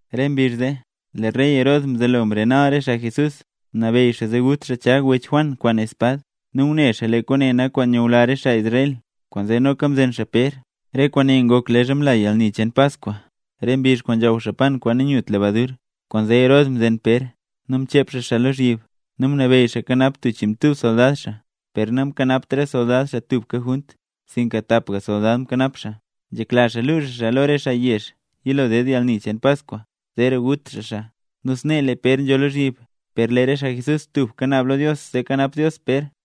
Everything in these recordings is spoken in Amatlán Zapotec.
Re mbizh zee, lee rey Herod mzelo mrenal re xaa Jesús. Mnabeyy xaa zee gut xaa Chag, wech Juan, kwaan espad. Nu ngune xaa lee kwaane nak kwaan nyula re xaa Israel, kwaanzee noka mzen xaa Pér. Re kwaane ngok leezha mla yalni cheen Paskwa, re mbizh kwaan nzhaw xaa pan kwaan nanyut lebadur. Kwaanzee Herod mzen Pér, nu mchep xaa xaa lozhyib, nu mnabeyy xaa kanap tub chiinmtub soldad xaa, per namkanapt re soldad xaa tubka junt, sinka tapga soldad mkanap xaa. Nzhekla xaa luu xaa xaa lo re xaa yezh yilo ded yalni cheen Paskwa, zeera gut xaa xaa. Nu snee lee Pér nzho lozhyib, per lee re xaa Jesús tubka naab xaa lo Dios zee kanap Dios Pér.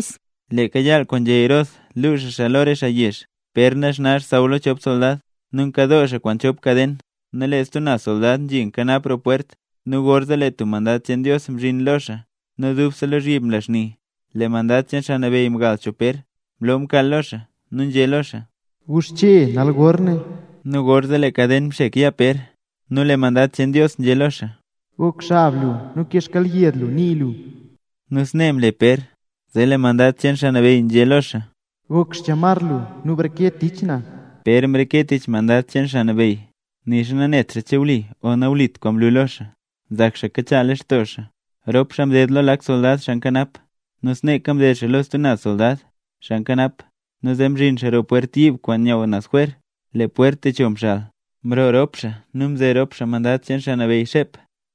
Leeka yaal kwaan nzhé Herod luu xaa xaa lo re xaa yezh, Pér naxna xsaww lo chop soldad, nu nkadoo xaa kwaan chop kaden nu lee stub naz soldad nzhi nkanap roo pwert. Nu gorzee lee tub mandad cheen Dios mzhin lo xaa nu dubse lozhyib mla xni. Lee mandad cheen Xaa Nabeyy mgal cho Pér, mloo mkaal lo xaa, nu nzhé lo xaa: —¡Guxche nal gor ne! Nu gorzee lee kaden mxek yaa Pér. Nu lee mandad cheen Dios nzhé lo xaa: —Gok xab lu nu kee xkyelyed lu nii lu. Nu snee mle Pér, zee lee mandad cheen Xaa Nabeyy nzhé lo xaa: —Gok xchamar lu nu breke tich na. Pér mreke tich mandad cheen Xaa Nabeyy, nixa nanet xaa che wli o nawlit kwaan mlu lo xaa, nzak xaa kachaa lextoo xaa. Rop xaa mded lo lak soldad xaa nkanap, nu sneeka mded xaa lo stub lak soldad xaa nkanap, nu zee mzhin xaa roo pwert yiib kwaan nyaww naz jwer, lee pwert techo mxal. Mroo rop xaa nu mze rop xaa mandad cheen Xaa Nabeyy xep,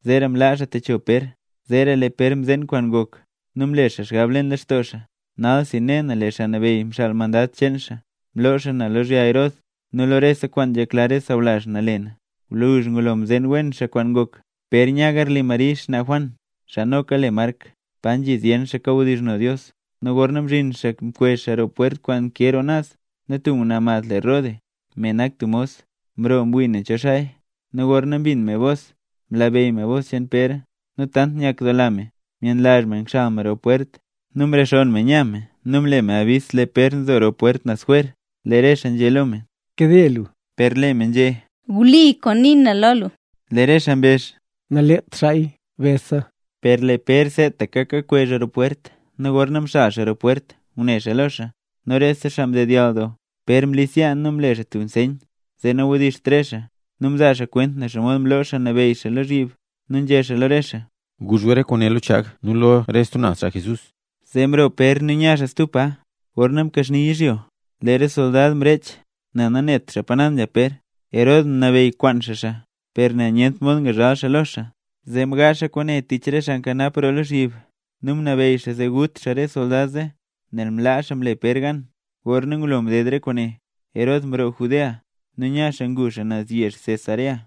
zeera mlaa xaa techo Pér. Zeera Pér mzeen kwaan ngok, nu mle xaa xgab leen lextoo xaa: “Nalsi, ne na lee Xaa Nabeyy mxaal mandad cheen xaa mloo xaa na lozhya Herod, nu lo rese kwaan nzhekla re sawlazh na le na”. Gwluzh ngulo mzeen wen xaa kwaan ngok, Pér nya garli Mari, xnaa Juan (xaa noka le Mark), pa nzhi zyen xaa kawdizhno Dios. Nu gorna mzhin xaa mkwezh xaa roo pwert kwaan nkee roo naz, nu tub ngwnaa mad le Rode, me nak tub mos, mroo mwii nen cho xaaya. Nu gorna mbin me bos, mlabeyy me bos cheen Pér, nu tant nyakdoola me, myenlazh me ngxal me roo pwert, nu mrexonn me nya me nu mle me yabis lee Pér nzo roo pwert naz jwer. Lee re xaa nzhé lo me: —¡Nkade lu! Per lee me nzhé: —Wli kwaan ngunii na lo gu. Lee re xaa mbezh: —Naleet xaaya, besa. Per lee Pér seetaka kakwezh roo pwert nu gorna mxal xaa roo pwert ngune xaa lo xaa, nu rese xaa mdedyall doo. Pér mlis yaa nu mle xaa tub nseyn zee nawdiizht re xaa, nu mzaa xaa kwent nen xomod mloo Xaa Nabeyy xaa lozhyib nu nzhé xaa lo re xaa: —Guzh gu re kwaane lo Chag nu lo re stub naz xaa Jesús. Zee mroo Pér nu nya xaa stub pa. Gorna mkaxni yizhyo, lee re soldad mrech nel nanet xaa pa naz nzha Pér. Herod mnabeyy kwaan xaa xaa, per nel nyent mod ngzhaal xaa lo xaa, zee mgaazh xaa kwaane tich re xaa nkanap roo lozhyib. Nu mnabeyy xaa zee gut xaa re soldad zee, nel mlaa xaa mle Pér gan. Gorna ngulo mded re kwaane, Herod mroo Judea nu nya xaa ngu xaa naz yezh Cesarea.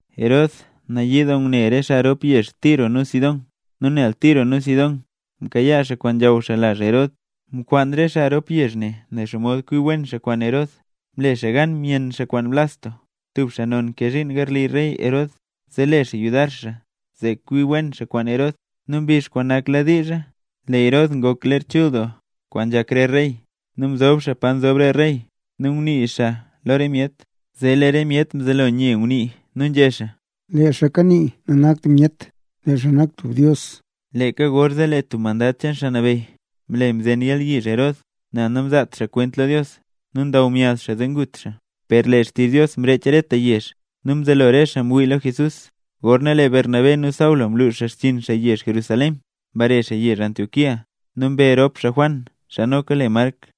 Herod nayii doo ngune re xaa rop yezh Tiro nu Sidón. Nu nel Tiro nu Sidón mkayaa xaa kwaan nzhaw xaa lazh Herod, mkwaan re xaa rop yezh ne nen xomod kwi wen xaa kwaan Herod. Mle xaa gan myenn xaa kwaan Blasto, tub xaa non nkee zhiin garli rey Herod, zee le xaa yudar xaa zee kwi wen xaa kwaan Herod. Nu mbizh nakladiizha, lee Herod ngok ler chul doo kwaan nzhak re rey, nu mzob xaa pa nzob re rey, nu ngunii xaa lo re myet. Zee lee re myet mzelo nye ngunii nu nzhé xaa: —¡Lee xaa kanii nanakt tub myet, lee xaa nak tub dios! Leeka gorzee lee tub mandad cheen Xaa Nabeyy mle mzen yalyizh Herod, nel namzaat xaa kwent lo Dios. Nu ndaw myaz xaa zee ngut xaa. Per lee xtizh Dios mrech reta yezh, nu mzelo re xaa ngwii lo Jesús. Gorna Bernabé nu Saulo mlux xaa xchiin xaa yezh Jerusalén, mbare xaa yezh Antioquía. Nu mbe rop xaa Juan, xaa noka le Mark.